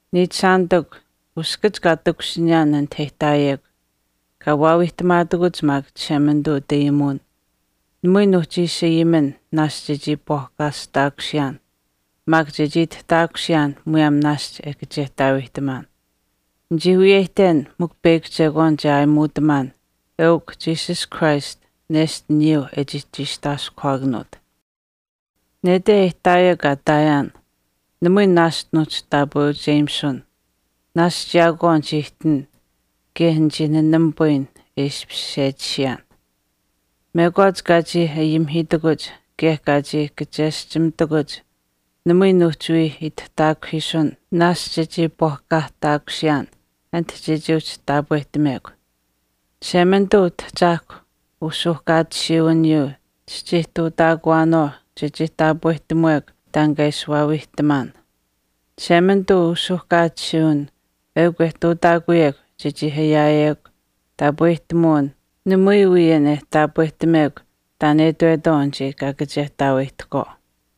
Niichishaanitikw, uskach kaa takushiniyaan anit e ihtaayekw, kaa wiihtamaatakuch maak Chishemanituu utayimuwin namui nuuhchi ishi ayimin naashch chechii iipwaahkaataakusiyaan maak chechii itihtaakusiyaan muyaam naashch e kachehtaaweyihtamaan. Nichii wiyeyihten mikw peyakw chekwaan che aayimuutamaan eukw Jesus Christ nesht aniyuu e chii chiistaaskuhwaakanuut. Nete e ihtaayekw kaa ihtaayaan namui naashch nuuhchi taapweucheyimisun. Naashch yaakwaau nichii ihtin kaye nichii nanamipayin e ishpish sechisiyaan. Mekwaach kaa chii ayimihiitakuch kaye kaa chii kacheschimitakuch namui nuuhchi wii itihtaakuhiisun naashch chechii iipwaahkaahtaakusiyaan ati chechii uhchi taapwehtamekw. Chishemanituu Utahchaahkwa usuuhkaatisiiwiniyuu eukw kaa ihtuutaakuyekw chechii taapwehtamuwekw taan kaa ishi waawiihtamaan. Chishemanituu usuuhkaatisiiwin eukw e ihtuutaakuyekw chechii ayaayekw taapwehtamuwin namui wii an e taapwehtamekw taan e itwetwaau anichii kaa kachehtaaweyihtahkwaau.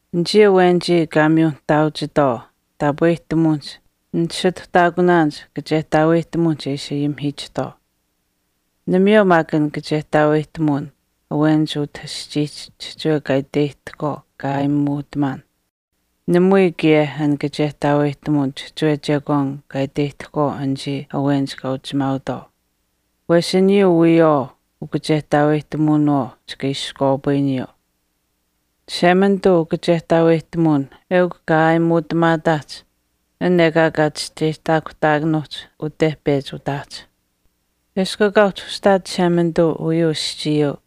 Anichii awenich kaa miyu nihtaauchitwaau taapwehtamuwinihch ninisituhtaakunaanich kachehtaaweyihtamuwinihch e ishi ayimihiichihtwaau. Namayeu maak an kachehtaaweyihtamuwin awenich utah aschiihch chihchiwe kaa iteyihtahkwaau kaa aayimuutamaan. Namayeu kaye an kachehtaaweyihtamuwin chihchiwe chekwaan kaa iteyihtahkwaau anichii awenich kaa uchimaautwaau. Wesh aniyuu wiyawaau ukachehtaaweyihtamuwinawaau chika iskwaapayiniyuu. Chishemanituu ukachehtaaweyihtamuwin eukw kaa aayimuutamaataahch an ekaa uhchi chischeyihtaakuhtaakunuuhch ute pechi utaahch. Eshkw ekaa uhchi ushihtaat Chishemanituu uyuu aschiiyuu,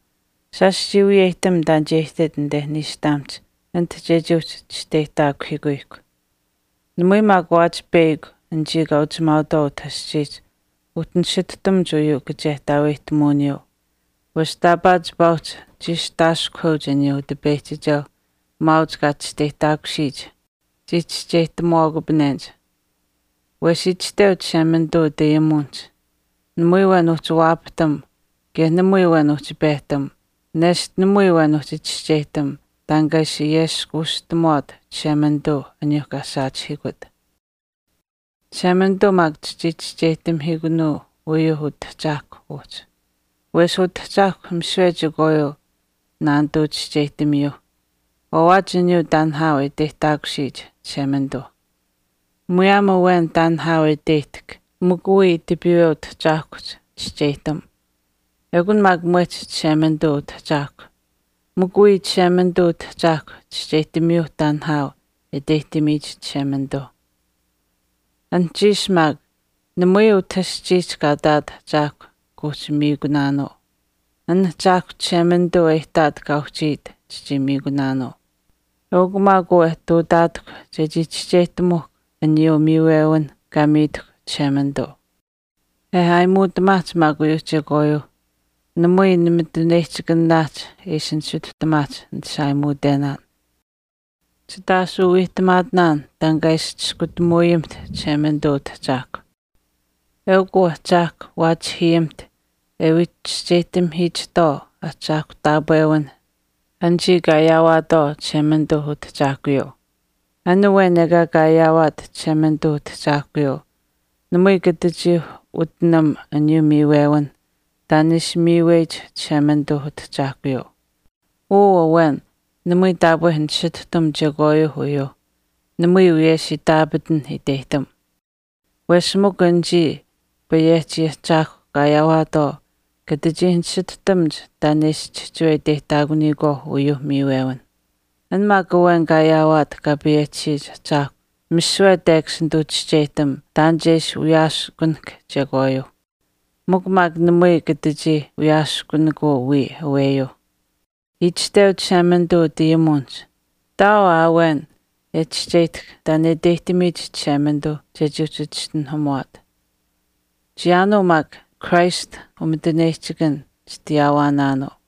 shaash chii wiyeyihtam taan che ihtit anite niishtamihch ati chechii uhchi chisteyihtaakuhiitahkw. Namui maak waawaach peyakw anichii kaa uchimaautwaau utah aschiihch uhchi nisihtuhtamuch uyuu kachehtaaweyihtamuwiniyuu wesh taapaa chipaa uhchi chiistaaskuhweuch aniyuu Utipeyihchikeuh maauch kaa chisteyihtaakusiyich chii chischeyihtamuwaakupanenich. Wesh itashteu Chishemanituu utayimuwinihch, Namui awen uhchi waapahtam kaye namui awen uhchi pehtam nesht namui awen uhchi chischeyihtam taan kaa ishi ayeskuushtamuwaat Chishemanituuh aniyuuh kaa saachihiikut. Chishemanituu maak chichii chischeyihtamihiikunuu uyuu Utahchaahkwa uhchi. Wesh Utahchaahkwa misiwe chekwaayuu naanituu chischeyihtamiyuuh, waawaach aniyuu taan nihaau e iteyihtaakusiyich Chishemanituuh. Muyaam awen taan nihaau e iteyihtahk mikw wiya tipiiwe Utahchaahkuhch chischeyihtam. Ekun maak mwehch Chishemanituu Utahchaahkwa, mikw wiya Chishemanituu Utahchaahkwa chischeyihtamiyuu taan nihaau e iteyihtamiyich Chishemanituuh. Anuhchiish maak, namui utah aschiihch kaa ihtaat ahchaahkw kuuhchi miikunaanuu, an Ahchaahkw Chishemanituu e ihtaat kaa uhchiit eukun an kaa miikuyihkw. Eukw maak uu e ihtuutaatahkw chechii chischeyihtamuhkw aniyuuh miiwewinh kaa miitahkw Chishemanituu. E aayimuutamaahch maak uyuuh chekwaayuuh namui nimituneyihchikanaahch e ishi nisituhtamaahch nit ishi aayimuutenaan. Chit aashuu wiihtamaatinaan taan kaa ishi chiskutamuuyamiht Chishemanituu Utahchaahkwa. Eukw uu Ahchaahkw waachihiyimiht e wii chischeyihtamihiichihtwaau Ahchaahkwa taapwewinh anichii kaa ayaawaatwaau Chishemanituu Utahchaahkuyuuh. An awen ekaa kaa ayaawaat Chishemanituuh Utahchaahkuyuu, namui katachii utinam aniyuuh miiwewinh taan e ishi miiweyich Chishemanituuh Utahchaahkuyuuh. Uu awen namui taapwe nisituhtam chekwaayuuh uyuuh, namui wiyesh itaapatanh iteyihtam. Wesh mikw anichii Payehchi Ahchaahkwa kaa ayaawaatwaau kata chii nisituhtamuch taan e ishi chihchiwe iteyihtaakuniyikwaauh uyuuh miiwewinh. An maak awen kaa ayaawaat Kaa payehchisiyich Ahchaahkwa misiwe tekash nituu chischeyihtam taan che ishi wiyaaskunahk chekwaayuu. Mikw maak namui kata chii wiyaaskunikuu wiya aweyuuh. Itashteu Chishemanituu utayimuwinihch, Ihtaau aa awen e chischeyihtahk taan e iteyihtamiyich Chishemanituu chechii uhchi chischinuhamuwaat. Chiyaanuu maak Christ umituneyihchikan chitayaawaanaanuu.